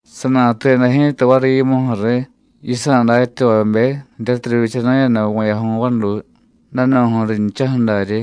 Sanatuyada ji̱ta variy yimuju̱ riy yisa̱ datyavabe jiryatiy rivyichanu̱yada vu̱yaju̱y vaduy, danu̱ju̱y rinchaju̱ daryi.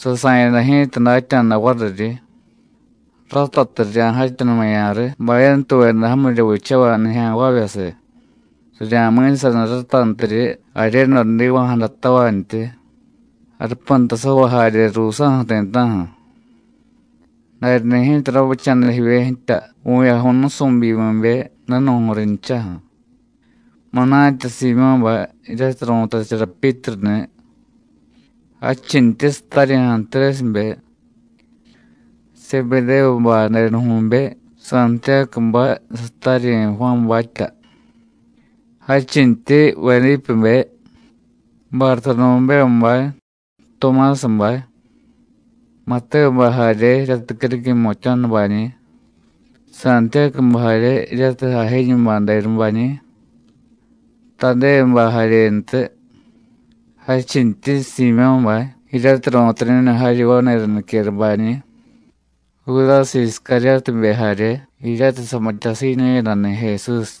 Sasa̱yada ji̱ta datya̱da variryi, ratatiy rirya̱jatyanumaya̱ riy bayantuveda jamirya vichavay nijya̱nvavyasiy; rirya̱mi̱saniy ratantiryi jaryedo jdiva̱jadatavantyi, jarupantasavay jarye ruusa̱ju̱ ti̱ta̱ju̱. Daryani̱ ji̱ta ravicha̱da jivye jtya vu̱yaju̱y nusu̱byimibe, danu̱ju̱y rinchaju̱: munatya Siimyó̱bay jiryatiy ru̱tachara Pyítruni̱, jadchintyi sataryi̱ Antrésibe, Sebedévubay denuju̱be Santiyácubay, sataryi̱ Juánbatya. Jadchintyi Vedípebe, Bartodomévubay, Tumásabay, Matévubay jarye jiryatiy criquiy jmutya̱nubañi̱, Santiyácubay jarye jiryatiy Ajéñubay denubañi̱, Tadévubay jaryentiy. Jadchintyi Siimyó̱bay jiryatiy ru̱tañu̱yada jaryi vani̱ra niquerabañi̱, Judásiy Iscaryótibe jarye jiryatiy samityasiiñu̱yadani̱ Jesús.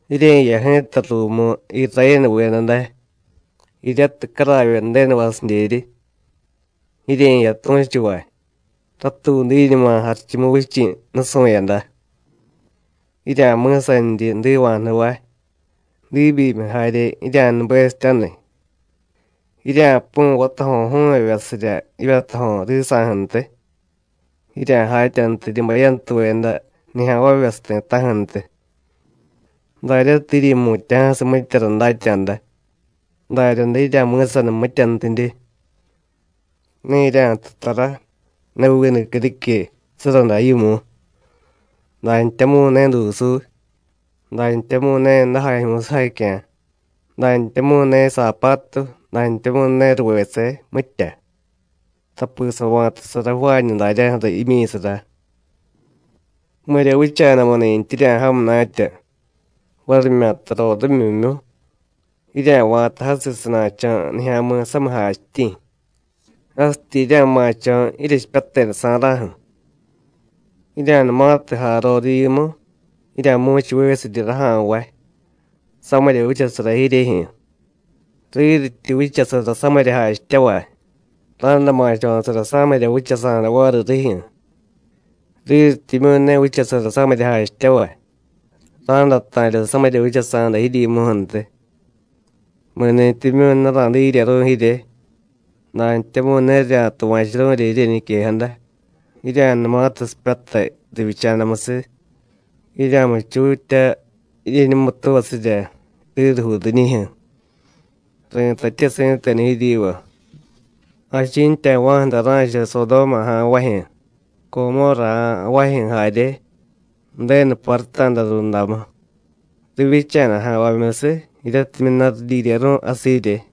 Jirye̱jiya ji̱ta ruumu Irayénuveda day, jiryatiy caravye Ju̱denuvasidyeryi. Jirye̱jiya tu̱chuvay: Ratuudiñuma Jarichumuvichi̱ nusu̱yada. Jirya̱mi̱saniryi jdiva̱jnuvay, diibyimiy jarye jirya̱nubesityaniy, jirya̱pu̱y vatajo̱ju̱vyevyasirya jivyatajo̱ risa̱ju̱ntiy, jirya̱jatyantiryi bayantuveda nijya̱nvavyasiy ti̱ta̱ju̱ntiy. Daryatiy jiryi̱mutya̱jasiy mityara datya̱da, daryaday jirya̱mi̱saniy mityantidye. Ne jirya̱jtu tara, ne vinu criquiy surraday yimu, dantyamu̱y ne dusuuy, dantyamu̱y ne dajajyu̱y sujacya̱, dantyamu̱y ne saapatu, dantyamu̱y ne ruvese mitya, tapi sava̱tasara ju̱vaañu daryaju̱ra jimyi̱sara. Mirya vicha̱damuni̱ttyi jirya̱jay munatya, varimyata rorimyimyu, jirya̱va̱ta jasiy sana̱cho̱ nijya̱mi̱ samiy jachityi̱, jasityi jirya̱ma̱cho̱ jiryechipyatedasa̱ra̱ju̱. Jirya̱numatiy jay rorivyimu, jirya̱mu̱chuvesiryi raja̱nvay: ¡Samirya vichasara jiryejyu̱! Riryityi vichasara samirya jachityavay, ra̱day ma̱cho̱sara samirya vichasa̱da variy rijyu̱; riryityimyu̱ ne vichasara samirya jachityavay, ra̱day ta̱rya samirya vichasa̱da jiryimuju̱ntiy. Mi̱ni̱tyimyu̱ ne ra̱diryeru̱y jirye, dantyamu̱y ne rirya̱tuva̱churu̱rya jiryeñiquejada, jirya̱numatiy sipyatay rivyicha̱damusiy, jirya̱muchutya jiryeñumutuvasirya rirujuu riñijyu̱. Ri̱tatye si̱tenu jiryiva: Jachi̱ntyava̱ju̱ day ra̱cha Sodóma ja̱nvajyu̱, Comórra ja̱nvajyu̱ jarye, Ju̱denu paruta̱da rundamu, rivyicha̱da ja̱nvamyusiy jiryatimyu̱ ne ridyiryeru̱y jasiy jirye.”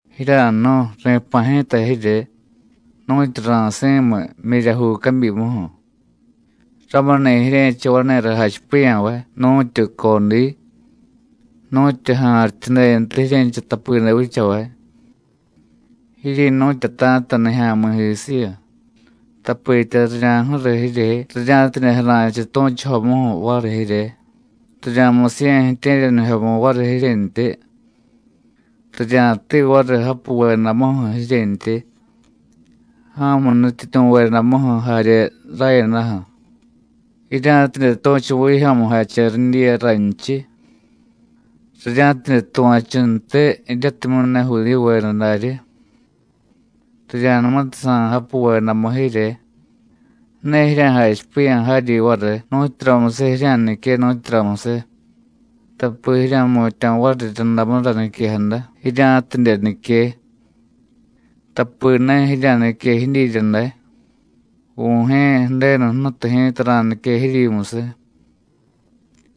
“Jirya̱jnu̱y, ri̱pa̱ ji̱ta jirye nu̱tyu ra̱si̱miy jmyiryajuu cabyimuju̱. Ramuni̱ jirye̱cha vani̱ra jachipiya̱vay nu̱tyu codiy, nu̱tyu ja̱rityudentiy jirye̱cha tapide vichavay. Jiryi̱nu̱tyata̱ta nijya̱mi̱jisiyu, tapitya rirya̱ju̱riy jirye rirya̱tidye jara̱chiy tu̱chujomuju̱ variy jirye, rirya̱musiye̱ ju̱tye̱ryanijyomu variy jiryentyi. Rirya̱tiiy variy japuvedamuju̱ jiryentyi, ja̱mu nutyityu̱vedamuju̱ jarye rayadaju̱, jirya̱tidye tu̱chu vijyo̱mujache ridyiya raynchiy, rirya̱tidye tuva̱chuntiy jiryatimyu̱ ne Judíyuveda daryi. Rirya̱numatiy sa̱y japuvedamu jirye, ne jirya̱jachipiya̱ jaryi variy nu̱tyuramusiy jirya̱nique, nu̱tyuramusiy, tapi jirya̱jmutya̱ variryundamura niquejada jirya̱tidye nique. Tapi ne jirya̱nique jidyirya day, Vu̱jye̱ Ju̱denu Jnutu ji̱ta ra̱nique jiryimusiy.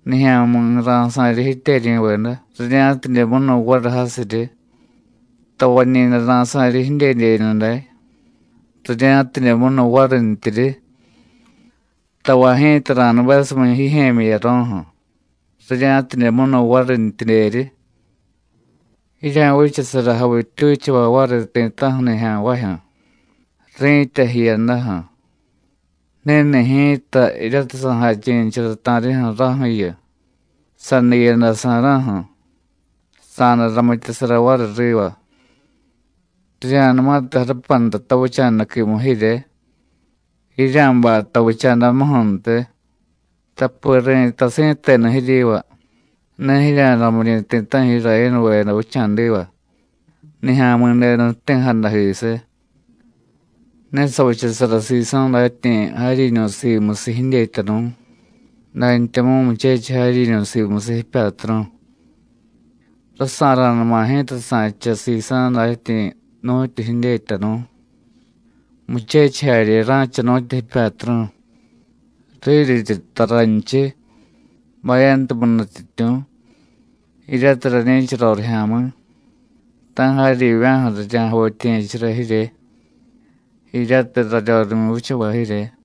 Nijya̱mi̱ ra̱sa̱ryi jityeryi̱veda rirya̱tidye munu variy jasiryi, tavañi̱day ra̱sa̱ryi jidyedyeñu day rirya̱tidye munu varintyiryi, tavay ji̱ta ra̱nubesumiy jijye̱myi jiyaro̱ju̱, rirya̱tidye munu varintyidyeryi. Jirya̱vichasara javittyuchavay variy ti̱ta̱ju̱ nijya̱nvajyu̱, ri̱tya jiyadaju̱. Ni̱ni̱ ji̱ta jiryatiy sa̱jachi̱nichara ta̱rijyu̱ raju̱yu, sadiiyada sa̱ra̱ju̱, sa̱day ramityasara variy riva. Rirya̱numatiy jarupanta tavicha̱daquimu jirye, jirya̱bay tavicha̱damuju̱ntiy, tapi ri̱tay si̱tenu jiryiva: Ne jirya̱ramiryi̱ ti̱ta̱ju̱ Irayénuveda vicha̱diva, Nijya̱mi̱denu jti̱jadajisiy. Ne savichasara sisa̱ datyi̱ jaryiñu̱ simusiy jidyetyanu̱, dantyamu̱y muchechiy jaryiñu̱ simusiy jipyatru̱. Rasa̱ra̱numa ji̱ta sa̱cha sisa̱ datyi̱ nu̱tyu jidyetyanu̱, muchechiy jarye ra̱cha nu̱tyu jipyatru̱. Riryityi jtay raynchiy: Bayantumiy nutyityu̱, jiryatiy rañi̱cha rorijya̱mi̱, ta̱ jaryivya̱ju̱ rirya̱javityiye̱chara jirye, jiryatiy raryorimyu vichavay jirye.”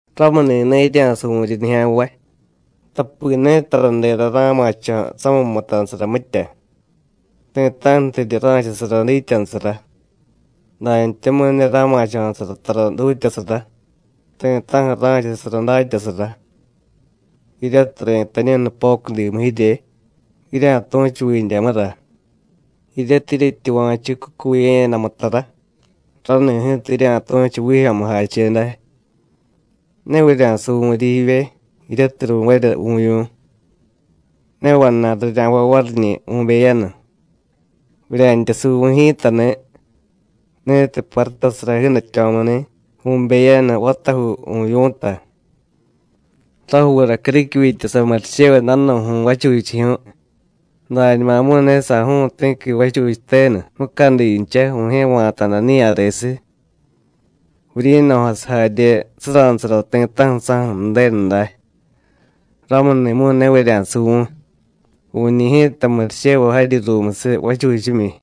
“Ramuni̱ ne jirya̱suvu̱ryi nijya̱nvay, tapi ne taradera ra̱ma̱cho̱ samiy mutanusara, mitya; ti̱ta̱ju̱tidye ra̱chasara dityanusara; dantyamu̱y ne ra̱ma̱cho̱sara tara dutyasara, ti̱ta̱ju̱ ra̱chasara datyasara. Jiryatiy ri̱tañu̱y nupocudimu jirye, jirya̱tu̱chu vindyamura; jiryatiy jiryetyuva̱chu cucuye̱yadamu tara, rani̱ ji̱ta jirya̱tu̱chu vijyo̱mujache day. Ne vurya̱suvu̱ryi jivye jiryatiy ru̱varya vu̱vyu̱, ne vana̱y rirya̱jvay variñi̱ vu̱beyanu. Vurya̱ntya suvu̱y ji̱tani̱ ni̱tiy parutasara jiidatyo̱muni̱ vu̱beyanu vatajuu vu̱vyu̱ta. Rajuura criquivyitya samurichevay danu̱ju̱y vachuchijyu̱y, dañumamu̱y ne saju̱u̱y ti̱qui vachuchiy tenu mucadincha Vu̱jye̱ va̱ta̱da niya̱resiy. Vuryi̱no̱jasiy jarye suranusara ti̱ta̱ju̱ saju̱ Ju̱denu day. Ramuni̱mu̱y ne vurya̱suvu̱y; vu̱ñi̱ ji̱ta murichevay jaryi ruumusiy vachuchimyi.”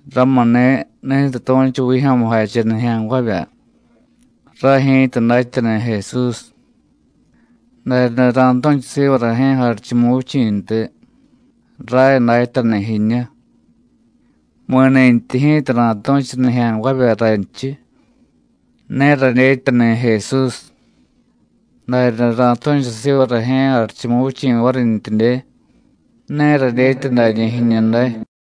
“Ramuni̱, ni̱tiy tu̱chu vijyo̱mujache nijya̱nvavya: Ray ji̱ta datyani̱ Jesús, daryaday ra̱tu̱chu siva Rajye̱ Jarichumuvichi̱ntiy: Ray datyani̱ jiñu. Mi̱nintyi ji̱ta ra̱tu̱chu nijya̱nvavya raynchiy: Ne radyetyani̱ Jesús, daryaday ra̱tu̱chu siva Rajye̱ Jarichumuvichi̱ varintyidye: Ne radyetya dañi̱ jiñu̱ day.”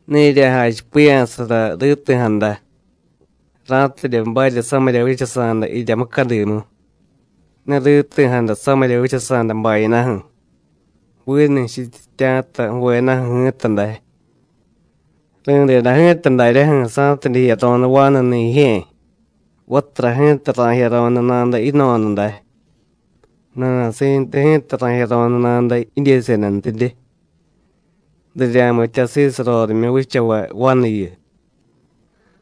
“Ne jirya̱jachipiya̱sara riti̱jada ra̱tidye barya samirya vichasa̱da jirya mucadimu. Ne riti̱jada samirya vichasa̱da bayadaju̱, vinu jchityitya̱ta ju̱vedaju̱ ji̱ta day. Ri̱deda ji̱ta daryaju̱ sa̱tidye jiyaro̱nu vanuni̱ jijye̱, vatura ji̱ta ra̱jiyaro̱nu nada yino̱da day, nana̱si̱ntu ji̱ta ra̱jiyaro̱nu nada jidyesedantidye. Rirya̱mityasiiy sarorimyu vichavay vanuyu.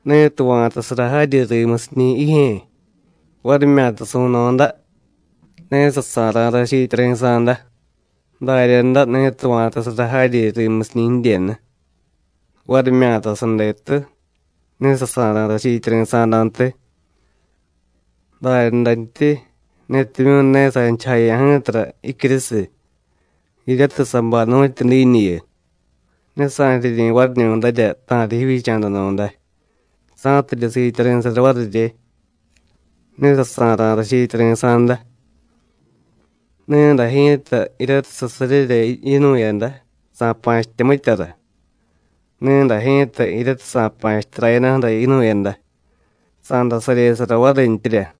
Ni̱tiy va̱tasara jaryi rimusiñi̱ jijye̱, varimyata su̱no̱da, ne sasa̱ra̱ rachiityari̱sa̱da; daryaday ni̱tiy va̱tasara jaryi rimusiñi̱ jidyenu, varimyata sadetu, ne sasa̱ra̱ rachiityari̱sa̱dantiy. Daryadantyi, ni̱timyu̱ ne sa̱nichujaya̱ ji̱tara jicyurusiy, jiryatiy sabay nu̱tyu diiñuyu, ne sa̱riryi̱ variñu̱darya ta̱riy jivyicha̱danu̱day, sa̱tidye siityari̱sara varirye, ne sasa̱ra̱ rachiityari̱sa̱da. Ni̱day ji̱ta jiryatiy sasaryera yinu̱yada, sa̱pa̱chitya mityara. Ni̱day ji̱ta jiryatiy sa̱pa̱chitya rayadaju̱ra yinu̱yada, sa̱day saryesara varintyirya.”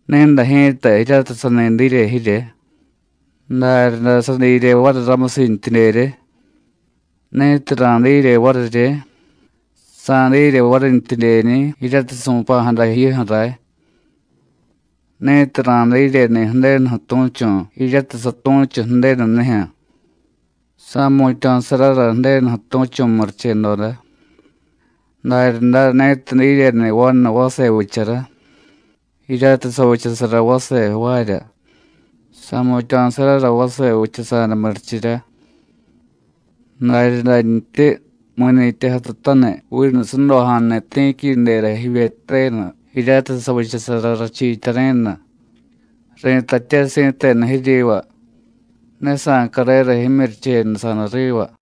“Ni̱day ji̱ta jiryatiy sani dirye jirye, daryaday sadirye variy ramusintyidyerye; ni̱tiy ra̱dirye varirye, sa̱dirye varintyidyeñi̱ jiryatiy su̱pa̱jada jiyuju̱ ray. Ni̱tiy ra̱diryeni̱ Ju̱denuju̱ tu̱chu̱ jiryatiy satu̱chu Ju̱denunijyu̱, sa̱jmutya̱sarara Ju̱denuju̱ tu̱chu̱ murichedoda. Daryaday ni̱tiy diryeni̱ vanu vase vichara jiryatiy savichasara vase jvaarya, sa̱jmutya̱sarara vase vichasa̱da murichirya. Daryadantyi mi̱nintyi jatutaniy vinu sudoja̱a̱ni̱ ti̱quidera jivyetyenu, jiryatiy savichasara rachiityari̱nu, ri̱tatye si̱tenu jiryiva: Ne sa̱carera jimyurichenusa̱da riva.”